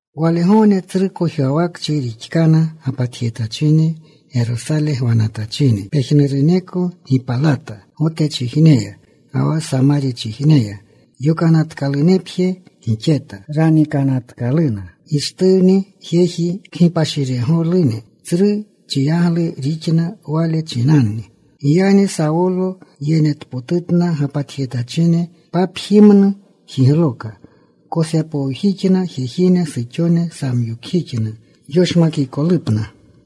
Walgogne tsru kojwawakchi rixkana gapatjetachine, Gerosale gwanatachine. Pejnuruneko gipalata Gotechijneya, ga wa Samarchijneya. Yokanatkalunepje gixeta. Ranikanatkaluna Gishtuwni jejine kgipashiregolune. Tsru chiyaglu rixna wale chinanni. Giyagni Sawolo yenetpotutna gapatjetachine. Papjimnu jigloka. Kosepowjixna jejine, suxone. Samyokjixna yoshmakikolupna.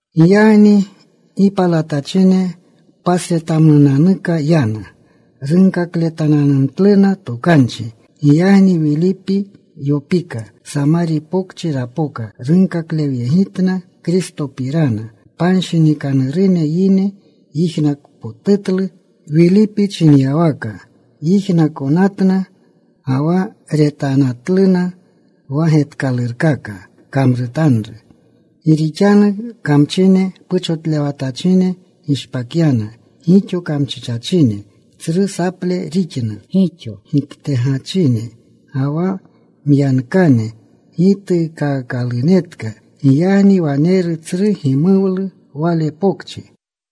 Giyagni gipalatachine pasretamnunanuka yana. Runkakletananumtluna tokanchi. Giyagni Wilipi yopika. Samari Pokchi rapoka. Runkaklewyegitna Kristopirana. Panshinikanurune yine yijnakpotutlu Wilipi chinyawaka. Yijnakonatna, ga wa retanatluna wa getkalurkaka kamrutanru. Gi rixanu kamchine puchotlewatachine gishpakyana gixo kamchichachine. Tsru saple rixna kamchine. Gixo giktegachine, ga wa myankane gituukaakalunetka. Giyagni waneru tsru gimuwlu wale pokchi.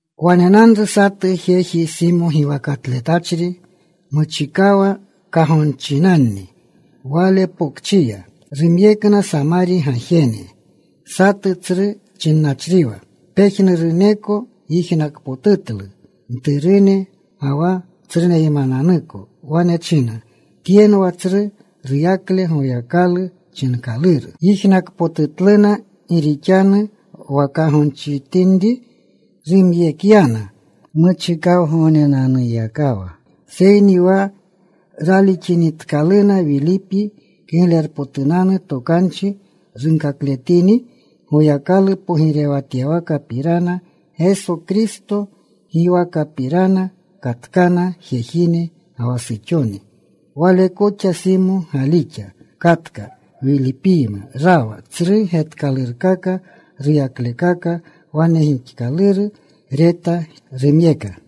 Wanenanru satu jeji Simo giwakatletachri. Muchikawa kagonchinanni wale pokchiya. Rumyekna Samari gajene. Satu tsru chinnachriwa. Pejnuruneko yijnakpotutlu, mturune ga wa tsruneymananuko. Wane chinna, “Tyenwa tsru ruyakle Goyakalu chinkaluru.” Yijnakpotutluna gi rixanu wa kagonchitinri rumyekyana muchikawgognenanuyakawa. Seyni wa ralixinitkaluna Wilipi Kiglerpotunanu Tokanchi runkakletini Goyakalu pogirewatyawakapirana, Geso Kristo giwakapirana, katkana jejine ga wa suxone. Wale koxa Simo galixa. Katka. Wilipiyma rawa. Tsru getkalurkaka, ruyaklekaka wane gixkaluru reta. Rumyeka.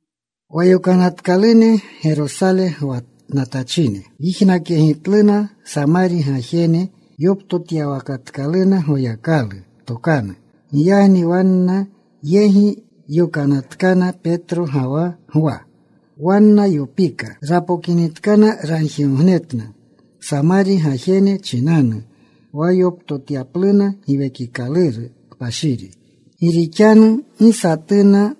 Wa yokanatkalune Gerosale gwanatachine yijnakyegitluna Samari gajene yoptotyawakatkalu Goyakalu tokanu. Giyagni wanna yegi yokanatkana Petro ga wa Gwa. Wanna yopika. Rapokinitkana ragjigognetna Samari gajene chinanu wa yoptotyapluna Giwekikaluru Kpashiri. Gi rixanu gi satuna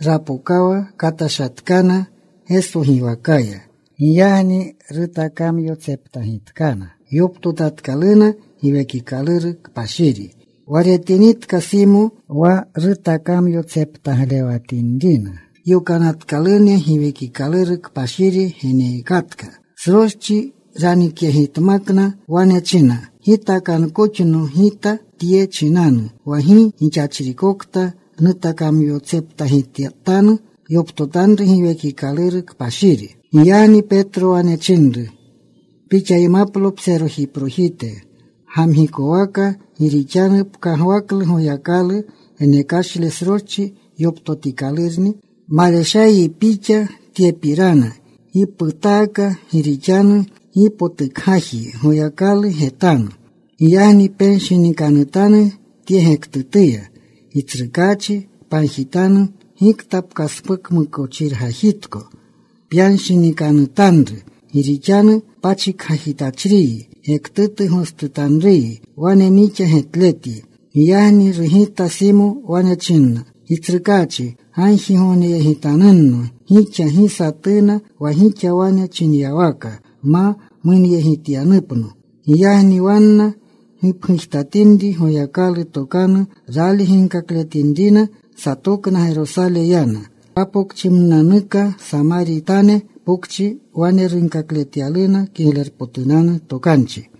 rapokawa. Katashatkana Geso giwakaya. Giyagni rutakamyotseptagitkana. Yoptotatkaluna Giwekikaluru Kpashiri. Wa retinitka Simo wa rutakamyotseptaglewatinrina yokanatkalune, Giwekikaluru Kpashiri geneekatka, sroschi ranikyegitmakna. Wane china, “Gitakankoxno gita tye chinanu, wa gi gixachrikokta nutakamyotseptagitanu, yoptotanru Giwekikaluru Kpashiri.” Giyagni Petro wane chinru, “Pixaymaplo pserojiprojite gamgikowaka, gi rixanu pkagwaklu Goyakalu genekashle sroschi yoptotikalurni. Maleshayyi pixa tyepirana. Gi putaaka. Gi rixanu gi potukgajyi Goyakalu getanu. Giyagni penshinikanutanu tye gektutuya. Gitsrukaachi pagjitanu gikta pkaspukmukochirgajitko pyanshinikanutanru. Gi rixanu pachikgajitachriyi, gektutu gostutanruyi wane nixa getletyi.” Giyagni rugita Simo. Wane china, “Gitsrukaachi gagjiyegitanunno gixa, gi satuna wa gixa wane chinyawaka ma munyegitkanupno.” Giyagni wanna gipgujtatinri. Goyakalu tokanu rali ginkakletinrina, satokna. Gerosale yana. Papokchimnunanuka Samaritane pokchi wane runkakletyaluna Kiglerpotunanu Tokanchi.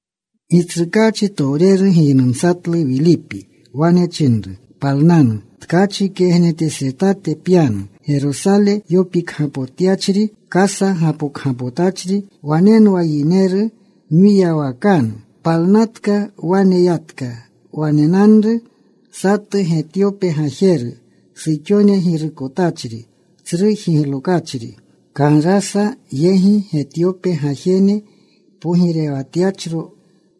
Gitsrukaachitowreru giynumatlu Wilipi. Wane chinru, “Palnanu. Tkachi kegnetesretate pyanu, Gerosale yopikgapotyachri. Kasa gapokgapotachri. Wanenwa yineru mwiyawakanu.” Palnatka. Wane yatka. Wanenanru satu Getyope gajeru, suxone girukotachri, tsru jiglokachri Kanrasa yegi Getyope gajene pogirewatyachro.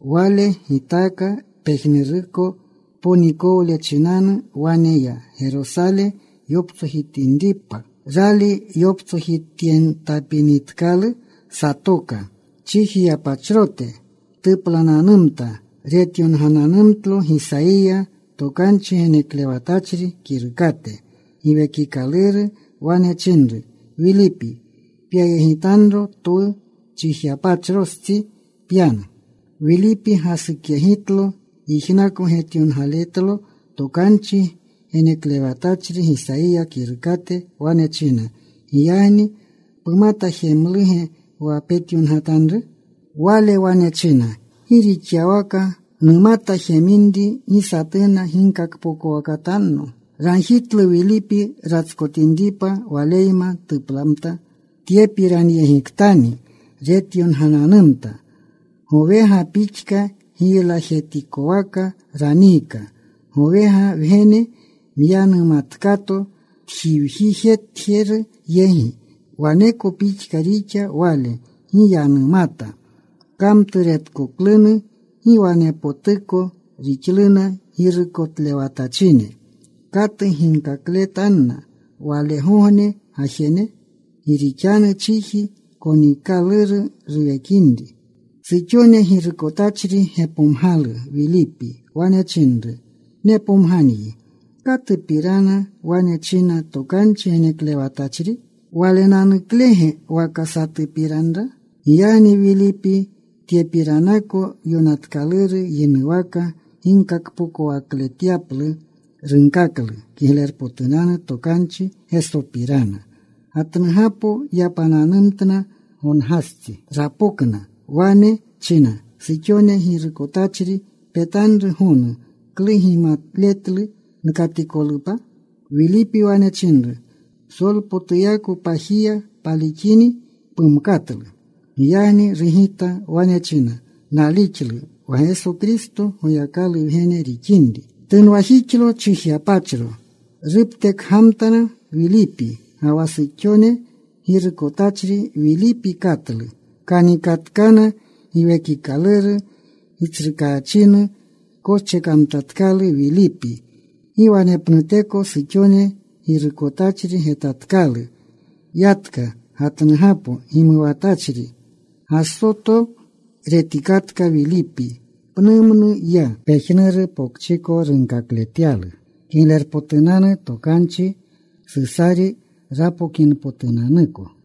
Wale gitaaka pejnuruko tponikole chinanu. Wane ya, Gerosale yoptsojtapinripa. Rali yoptsojityentapinitkalu, satoka. Chijiyapachrote tuplananumta. Retyongananumtlo Gisayiya tokanchi geneklewatachri kirukate. Giwekikaluru wane chinru Wilipi, “Pyayegitanro. Twu chijiyapachrostsi pyanu.” Wilipi gasukyegitlo. Yijnako getyongaletlo tokanchi geneklewatachri Gisayiya kirukate. Wane china, “Giyagni ¿pumata jemluge wa peta yongatanru?” Wale wane china, “¿Gi rixyawaka numata jeminri gi satuna ginkakpokowakatanno?” Ragjitlu Wilipi ratskotinripa, waleyma tuplamta. Tyepiranyegiktani retyongananumta: Gowega pixka giylajetikowaka raniika. Gowega wgene myanumatkato tjiwjitjeru yegi, waneko pixka rixa Wale. Gi yanumata. Kamturetkoklunu gi wanepotuko rixluna girukotlewatachine. ¿Katu ginkakletanna walegogne gajene? Gi rixanu chiji konikaluru ruwekinri. Suxone girukotachri gepomgalu Wilipi. Wane chinru, “Nepomganyi. ¿Katupiranni wane china tokanchi geneklewatachri? ¿Walenanuklege waka satupiranra?” Giyagni Wilipi tyepiranako yonatkaluru yinuwaka ginkakpokowakletyaplu. Runkaklu Kiglerpotunanu Tokanchi Gesopirana. Gatnugapo yapananumtna. Gongastsi rapokna. Wane china suxone girukotachri, “Petanru gonu. ¿Klu gimaletlu nkatikolupa?” Wilipi wane chinru, “Psolpotuyako pajiya palixini, pumkatlu.” Giyagni rugita. Wane china, “Nalixlu wa Geso Kristo Goyakalu Wgene rixinri.” Tunwajixlo chijiyapachro. Ruptekgamtna Wilipi ga wa suxone girukotachri. Wilipi katlu. Kanikatkana. Giwekikaluru Gitsrukaachinu koschekamtatkalu Wilipi. Gi wanepnuteko suxone girukotachri getatkalu. Yatka gatnugapo gimuwamtachri. Gasoto retikatka Wilipi. Pnumnu ya. Pejnuru pokchiko runkakletyalu Kiglerpotunanu Tokanchi, Susari rapokinpotunanuko.